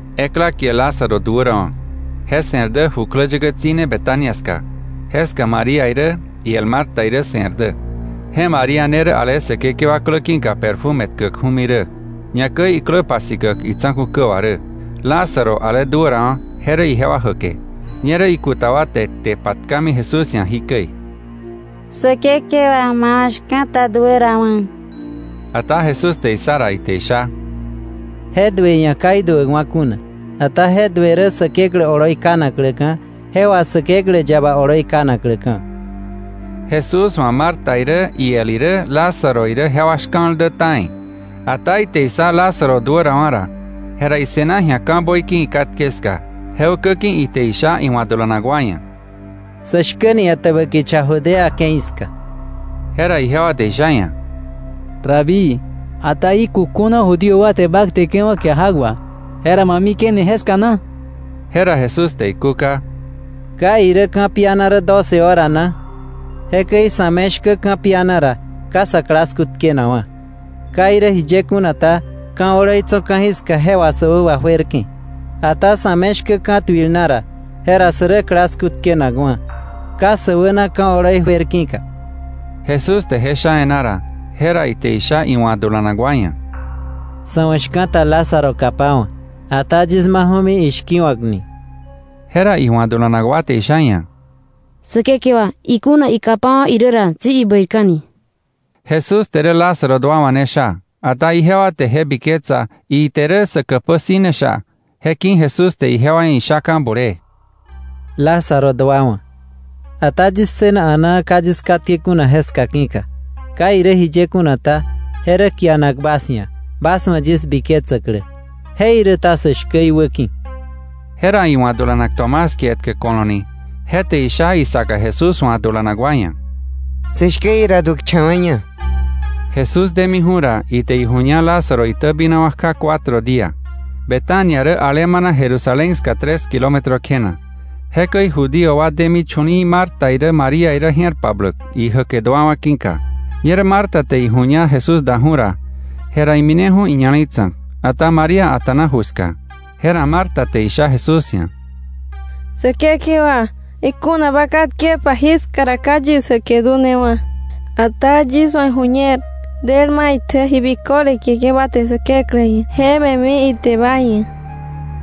Ekla kie Lázaro duärawa̱. Je se̱r dä jukläyäkä tsi̱ne Betania ska. Jeska María irä iel Marta irä se̱r dä. Je María ne rä ale Säkekewa klä ki̱ka perfume tkäkju̱mi rä, ñakäi iklä pasikäk itsa̱ku̱ kä wà rä. Lázaro, ale duärawa̱, je rä ijewa jäke. Ñerä ikuta wa te kte patkami Jesús ia̱ jikäi: —Säkekewa, ma wa̱ shka̱ta duärawa̱. Ata Jesús te issa ra, ite isha: —Je duë ia̱ ka iduäkwa̱ kuna, ata je duë rä Säkeklä oloi kanakläka̱, je wà Säkeklä yaba oloi kanakläka̱. Jesús wa̱ Marta irä iel irä, Lázaro irä jewa shka̱l dä ta̱i. Ata ite issa Lázaro duärawa̱ ra, jera ise̱na ji̱a ka̱ böiki ikatke ska. Je ukä ki̱ ite isha iwa̱ dulanak wa ia̱: —Sä shkäni etäbä kicha Judea ke̱i ska. Jera ijewa te isha iia̱: —Rabí, ata jí kukjuna Judío wa te bä kteke̱wa̱ kia jak wà. ¿Jera ma mike̱ni jeska na? Jera Jesús te ikúka: —¿Ka irä ka̱piana rä doce hora na? Jekäi sa̱ me shkä ka̱piana ra, ka sa klasku tkenakwa̱. Ka irä jiye kuna ta, ka̱ oloi tso̱ ka̱jiska je wà sä wä wajuerke̱. Ata sa̱ me shkä ka̱tuil na ra, jera sä rä klasku tkenakwa̱, ka sä wäna ka̱ oloi juer ki̱ka. Jesús te je sha e̱ná ra, jera ite isha iwa̱ dulanak wa ia̱: —Sa̱ wa̱ shka̱ta Lázaro kapawa̱, ata yis maju̱mi ishki̱wa̱kni. Jera iwa̱ dulanak wa te isha iia̱: —Säkekewa, ikuna ikapawa̱ irä ra, tsi ibäirka̱ni. Jesús te rä Lázaro duawa̱ ne sha, ata ijewa te je biketsa ite rä sä käpä si̱ ne sha. Je ki̱ Jesús te ijewa ia̱ ishaka̱ bulee: —Lázaro duawa̱. Ata yis ssëna a̱naa ka yis katke kuna jeska ki̱ka. Ka irä jiye kuna ta, je rä kianak bas ia̱, bas wa̱ yis biketsäklä. Jeiräta sä shkä iwäki̱. Jera iwa̱ dulanak Tomás kie etkä Ko̱lo̱ ni, je te isha isaka Jesús wa̱ dulanak wa ia̱: —Sä shkä ira duäkcha̱wa̱ña. Jesús demiju̱ ra, ite iju̱ña Lázaro itäbinawa̱ kja cuatro día. Betania rä alemana Jerusalén ska tres kilómetro kjena. Jekäi Judío wa demi chu̱li̱i̱ Marta irä María irä je̱r pabläk, ijäke duawa̱ ki̱ka. Ñerä Marta te iju̱ña Jesús daju̱ ra, jera imineju̱ iña̱le̱i tsa̱k, ata María a̱ta̱na ju ska. Jera Marta te isha Jesús ia̱: —Säkekewa, ikuna ba katkepa jiska ra, ka yis jäke dunewa̱. Ata yis wa̱ iju̱ñer del maitjä ji biköle kieke̱ ba te Säkeklä ia̱ je me̱mi ite ba ia̱.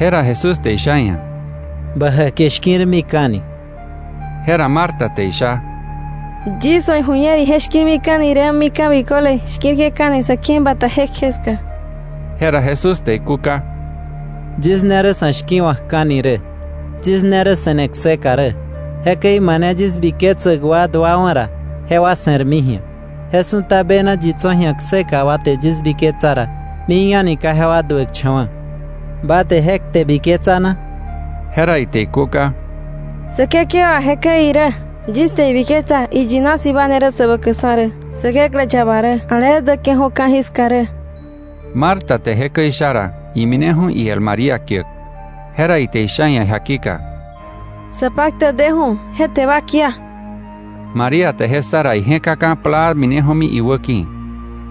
Jera Jesús te isha iia̱: —Bä jäke shki̱rmika̱ni. Jera Marta te isha: —Yis wa̱ iju̱ñer ije shki̱rmika̱ni rä mika̱ biköle shki̱rke̱ka̱ni sa̱ ke̱i bata jekje ska. Jera Jesús te ikúka: —Yis ne rä sa̱ shki̱wa̱kka̱ni rä, yis ne rä se̱ne kseka rä. Jekäi mane yis biketsäk wa duawa̱ ra, jewa se̱rmi ji̱a. Je su̱ta bena yi tso̱ ji̱a kseka wa te yis biketsa ra, mik a̱ni ka jewa duäkcha̱wa̱. ¿Ba te je kte biketsa na? Jera ite ikúka: —Säkekewa, jekäi irä, yis te ibiketsa iyina si̱ ba ne rä Säbäkäkksa̱ rä, Säkeklä yaba rä, ale däke̱ju̱ ka̱jiska rä. Marta te jekäi isha ra, imineju̱ iel María kiäk. Jera ite isha iia̱ jakika: —Sapaktäk deju̱. Je te ba kia. María te je ssa ra, ije̱kaka̱ plaa mineju̱mi iwäki̱.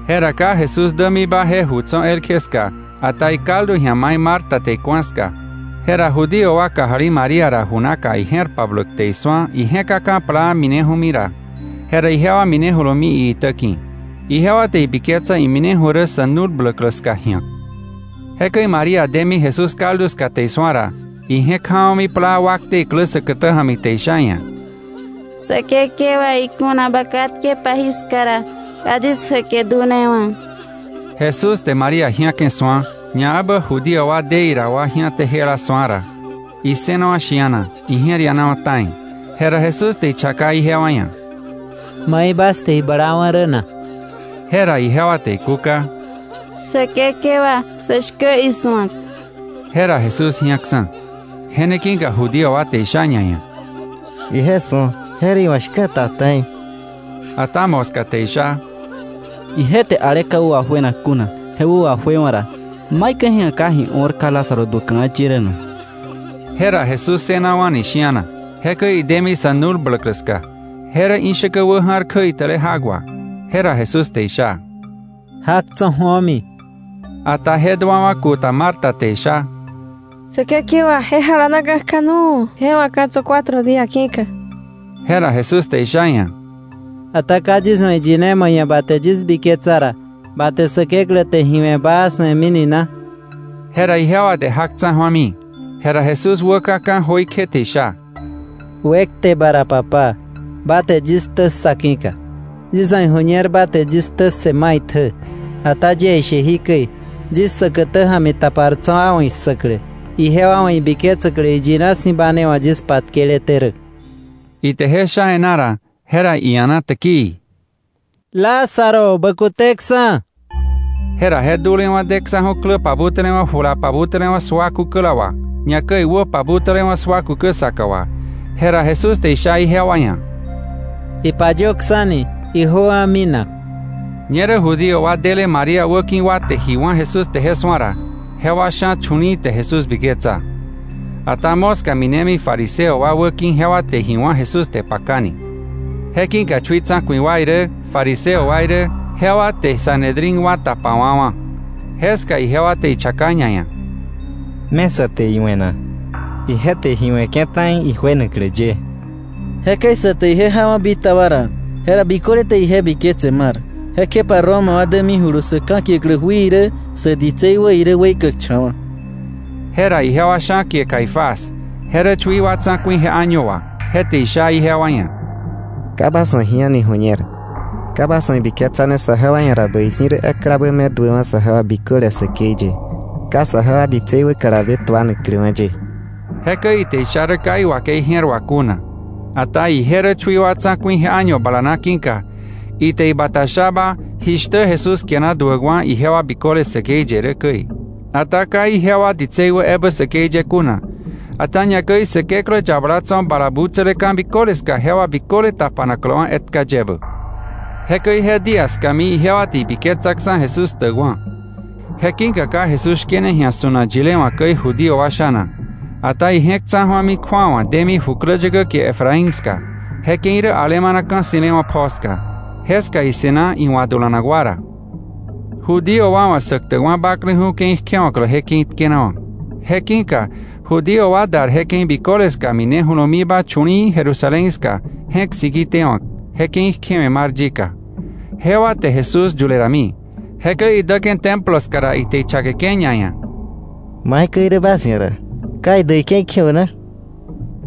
Jera ka Jesús dämiba je ju tso̱ elkje ska, ata ikaldu ji̱a mai Marta te iku̱a ska. Jera Judío wa kajali María ra ju naka ije̱r pabläk te isu̱a ije̱kaka̱ plaa mineju̱ ra, jera ijewa minejulumi iitä ki̱. Ijewa te ibiketsa imineju̱ rä sa̱ nu̱l bläklä ska ji̱ak. Jekäi María demi Jesús kaldu ska te isu̱a ra, ije̱k ja̱wa̱mi plaa wakte iklä säkätä ja̱mi te isha iia̱: —Säkekewa, ikuna ba katkepa jiska ra, ka yis jäke dunewa̱. Jesús te María ji̱ake̱ su̱a, ñaebä Judío wa de ira wa ji̱ate jela su̱a ra, issënawa̱ shi̱ana, ije̱r ianawa̱ ta̱i. Jera Jesús te ichaka ijewa ia̱: —¿Mai bas te iblawa̱ rä na? Jera ijewa te ikúka: —Säkekewa, sä shkä isu̱ak. Jera Jesús ji̱aksa̱. Je ne ki̱ka Judío wa te isha ñaia̱: —Ije su̱o. Je rä iwa̱ shka̱ta ta̱i. Ata moska te isha: —Ije te ale ka wä wajuenak kuna je wä wajuewa̱ ra, ¿maikäi ka je ia̱ ji o̱r ka Lázaro duäkläwa̱ ye rä na? Jera Jesús ssënawa̱ni shi̱ana. Jekäi idemi sa̱ nu̱l bläklä ska. Je rä ishäkä wä ja̱r kjäitäle jak wà. Jera Jesús te isha: —Jak tso̱ ju̱omi. Ata je duawa̱ kuta Marta te isha: —Säkekewa, ije jalanaka̱ kja nu̱u̱, je wa̱ ka̱ tso̱ cuatro día ki̱ka. Jera Jesús te isha iia̱: —Ata ¿ka yis wa̱ iyine ma ia̱ ma je̱r ja̱no ra, ba te Säkeklä te ji we̱ baa su̱emini na? Jera ijewa te jak tsa̱ju̱ami. Jera Jesús wäkaka̱ jöikje te isha: —Wekte ba ra Papá, ba te yis ktä ssa ki̱ka. Yis wa̱ iju̱ñer ba te yis ktä ssë maitjä. Ata yie ishe jikäi, yis säkätä ja̱mi tapar tso̱ wa wa̱ issäklä, ijewa wa̱ ibiketsäklä iyina si̱ ba ne wa̱ yis patkeleté rä. Ite je sha e̱ná ra, jera ia̱na täkii: —Lázaro, bä kuteksa̱. Jera je dulewa̱ deksa̱ju̱ klä pabutälewa̱ jula pabutälewa̱ sua kukäla wà, ñakäi wä pabutälewa̱ sua kukä saka wà. Jera Jesús te isha ijewa ia̱: —Ipayöksa̱ni, ijöwa̱ minak. Ñerä Judío wa dele María wäki̱ka wa te ji wá̱ Jesús te je su̱a ra, jewa sha̱ chu̱li̱i̱ te Jesús biketsa. Ata moska minemi fariseo wa wäki̱, jewa te ji wá̱ Jesús te pakani. Je ki̱ka chui tsa̱ku̱i wa irä, fariseo wa irä, jewa te Sanedrín wa tapawa̱wa̱. Jeska ijewa te ichaka ñaia̱: —¿Me sa te iwe̱ na? Ije te ji we̱ke̱ ta̱i ijuenaklä ye. Jekäi sa te ije jawa̱ bitaba ra, jera biköle te ije biketse mar. Jekjepa ra Roma wa dämijulu sa̱ ka̱kiäklä jui irä, sä ditsei wä irä, weikäkcha̱wa̱. Jera ijewa sha̱ kie Caifás, je rä chui wa tsa̱ku̱i je año wà, je te isha ijewa ia̱: —Ka bas wa̱ ji a̱ni ju̱ñer. Ka bas wa̱ ibiketsane saje wa ia̱ ra bäi si̱ rä eklabä me duäwa̱ sajewa biköle säkei ye, ka saje ditsei wä kalabe tuanakläwa̱ ye. Jekäi ite isha rä ka iwakei je̱r wà kuna. Ata ije rä chui wa tsa̱ku̱i je año bala na ki̱ka, ite ibata shaba jishtä Jesús kiana duäkwa̱ ijewa biköle säkei ye rä käi. Ata ka ijewa ditsei wä ebä säkei ye kuna, ata ñakäi Säkeklä yabala tso̱ bala butsäle ka̱ biköle ska jewa biköle tapanakläwa̱ etka yebä. Jekäi je día skami ijewa te ibiketsaksa̱ Jesús ktäkwa̱. Je ki̱ka ka Jesús shkene ji̱a su̱nak yile wa̱ käi Judío wa sha̱na, ata ije̱k tsa̱ju̱ami kju̱awa demi jukläyäkä kie Efraín ska. Je ke̱i rä alemana ka̱ ssi̱lewa̱ pjoo ska. Jeska ise̱na iwa̱ dulanak wa ra. Judío wa wa̱ Säktäkwa̱ Bakleju̱ ke̱i kjewa̱klä je ke̱i tkenawa̱. Je ki̱ka Judío wa dar je ke̱i biköle ska minejulumiba chu̱li̱i̱ Jerusalén ska je̱k siki tewa̱k, je ke̱i kjewe̱ mar yika. Jewa te Jesús yule rami. Jekäi idäke̱ Templo ska ra, ite ichakeke̱ ñaia̱: —¿Maikäi irä bas ia̱ ra? ¿Ka idäk ike̱i kjewa̱k na?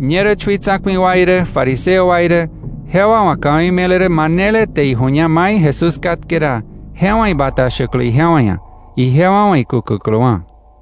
Ñerä chui tsa̱ku̱i wa irä, fariseo wa irä, jewa wa̱ ka̱wei me̱le rä manele te iju̱ña mai Jesús katke ra, je wa̱ ibata shäklä ijewa ia̱, ijewa wa̱ ikukäkläwa̱.